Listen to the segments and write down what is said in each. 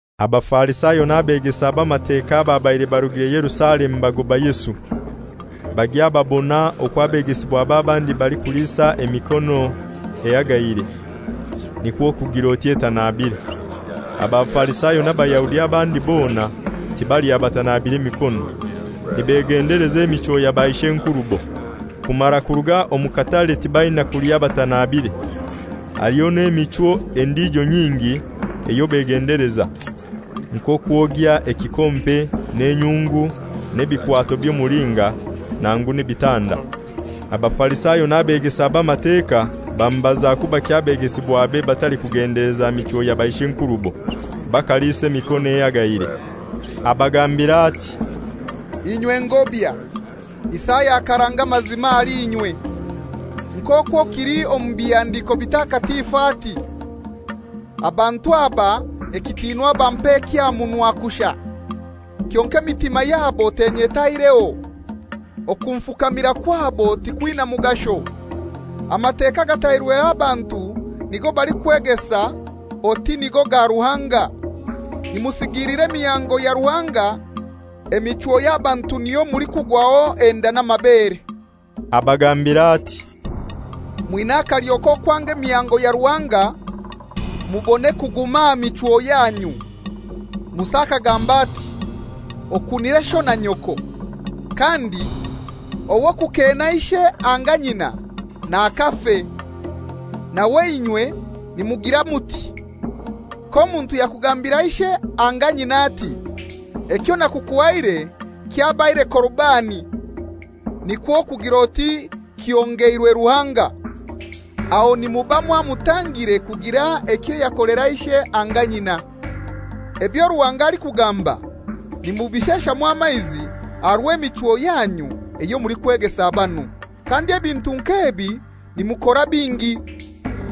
Abafarisayo n'abegesa b'Amateka ababaire barugire Yerusalemu bagoba Yesu, bagya babona okwo abegesibwabe abandi balikuliisa emikono ehagaire, nikwo kugir'oti etanabire. (Abafarisayo n'Abayahudi abandi bona, tibalya batanabire mikono, nibegendeleza emichwo ya baish'enkurubo. Kumara kuruga omu katare tibaina kulya batanabire. Haliho n'emichwo endijo nyingi eyo begendeleza, nk'okwogya ekikompe n'enyungu n'ebikwato by'omulinga nangu n'ebitanda.) Abafarisayo n'abegesa b'Amateka bamubaza kubaki abegesibwabe batalikugendeleza michwo ya baishenkurubo, bakalisa emikono ehagaire. Abagambira ati, «Inywe ngobya, Isaya akaranga amazima ahali inywe, nk'okwo kili omu bihandiko bitakatifu, ati ‹Abantu aba ekitinwa bampa eky'aha munwa kushai, kyonkai emitima yabo tenyetaireho; okunfukamira kwabo tikwina mugasho, Amateka agatairweho abantu nigo balikwegesa oti nigo ga Ruhanga.› Nimusigiilira emihango ya Ruhanga, emichwo ey'abantu niyo mulikugwaho enda n'amabere.» Abagambira ati, «Mwina akalyo k'okwanga emihango ya Ruhanga, mubone kuguma aha michwo yanyu! Musa akagamba ati, ‹Okunire sho na nyoko;› kandi ‹Ow'okukeena ishe anga nyina nakafe.› Nawe inywe nimugira muti, ‹K'omuntu yakugambira ishe anga nyina ati: Ekyo nakukuhaire kyabaire Korubani› (nikwo kugir'oti kihongeirwe Ruhanga) aho nimuba mwamutangire kugira ekyo yakolera ishe anga nyina, ebyo Ruhanga alikugamba nimubisheshamu amaizi aha rw'emichwo yanyu eyo mulikwegesa banu. Kandi ebintu nk'ebi nimukora bingi.»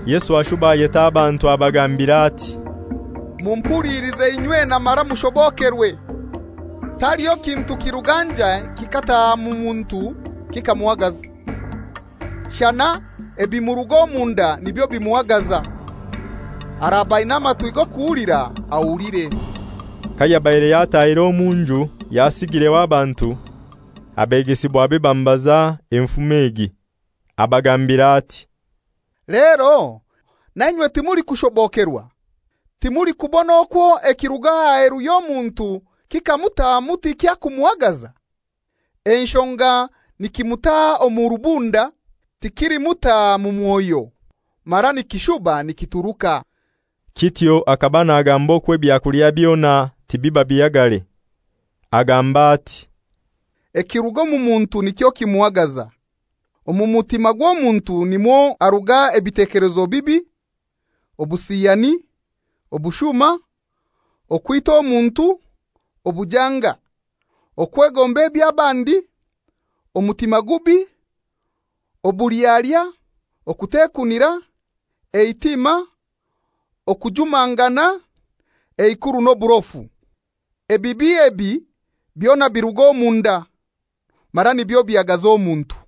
Yesu ashuba ayeta abantu abagambira ati, «Mumpulilize inywena mara mushobokerwe: taliho kintu kiruga njai kikataha mu muntu kikamuhagaza, shana ebimuruga omunda nibyo bimuhagaza. [Araba aina amatwi g'okuhulira ahulire.»] Kayabaire yatahire omunju yasigireho abantu, abegesibwabe bamubaza enfumo egi. Abagambira ati, «Lero nainywe timulikushobokerwa? Timulikubona okwo ekiruga aheru y'omuntu kikamutahamu tikyakumuhagaza? Enshonga nikimutaha omu rubunda, tikilimutaha mu mwoyo, mara nikishuba nikituruka.» (Kityo akaba nagamba okwo ebyakulya byona tibiba bihagare.) Agamba ati, «Ekiruga omu muntu nikyo kimuhagaza. Omu mutima gw'omuntu nimwo haruga ebitekelezo bibi: obusiyani, obushuma, okwita omuntu, obujanga, okwegomba eby'abandi, omutima gubi, obulyalya, okutekunira, eitima, okujumangana, eikuru n'oburofu. Ebibi ebi byona biruga omunda, mara nibyo bihagaza omuntu.»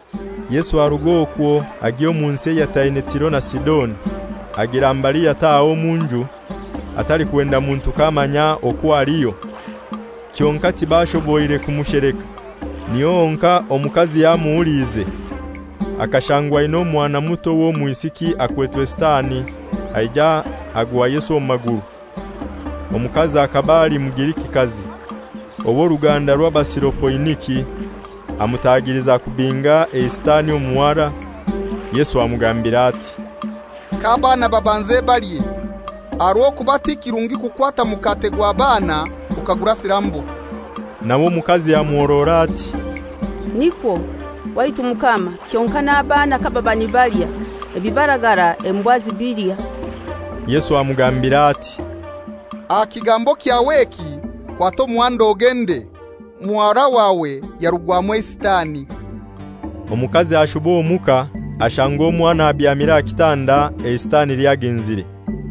Yesu arug'okwo agya omu nsi eyataine Tiro na Sidoni. Agira mbali yataha omu nju, atalikwenda muntu k'amanya okwo aliyo, kyonkai tibashoboire kumusheleka. Niho honkai omukazi yamuhuliize. Akashangwa aina omwana muto w'omwisiki akwetwe Sitani, aija agwa Yesu omu maguru. Omukazi akaba ali Mugirikikazi, ow'oruganda rw'Abasirofoiniki. Amutagiliza kubinga eiSitani omu muhara. Yesu amugambira ati, «K'abaana babanze balye, aha rw'okuba ti kirungi kukwata mukate gw'abaana okagurasira mbwa.» Nawe omukazi amuhorora ati, «Nikwo, waitu Mukama, kyonkai n'abaana kababa nibalya, ebibaragara embwa zibilya.» Yesu amugambira ati, «Aha kigambo kyawe eki kwata omuhanda ogende, muhara wawe yarugwamu eiSitani.» Omukazi ashuba omuka, ashanga omwana abyamire aha kitanda, eiSitani lyagenzire.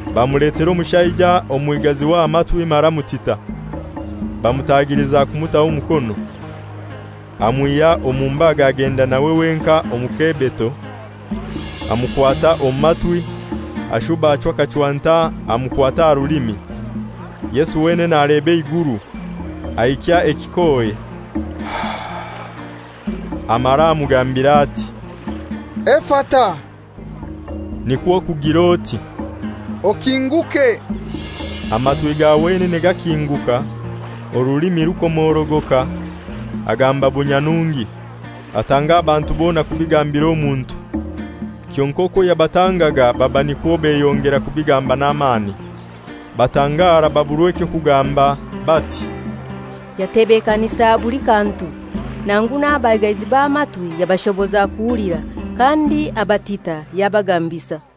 Bamuletera omushaija omwigazi w'amatwi mara mutita. Bamutagiliza kumutaho omukono. Amwihya omu mbaga agenda nawe wenkai omu kebeto, amukwata omu matwi, ashuba achwa akachwanta amukwata aha rulimi. Yesu wenene aleba eiguru, aikya ekikohe, amara amugambira ati, «Efata,» nikwo kugir'oti, «Okinguke.» Amatwi ga wenene gakinguka, orulimi rukomorogoka, agamba bunyanungi. Atanga abantu bona kubigambira omuntu. Kyonkai okwo yabatangaga baba nikwo beyongera kubigamba n'amani. Batangara, baburwa eky'okugamba, bati, «Yatebekanisa buli kantu; nangu n'abaigazi b'amatwi yabashoboza kuhulira, kandi abatita yabagambisa.»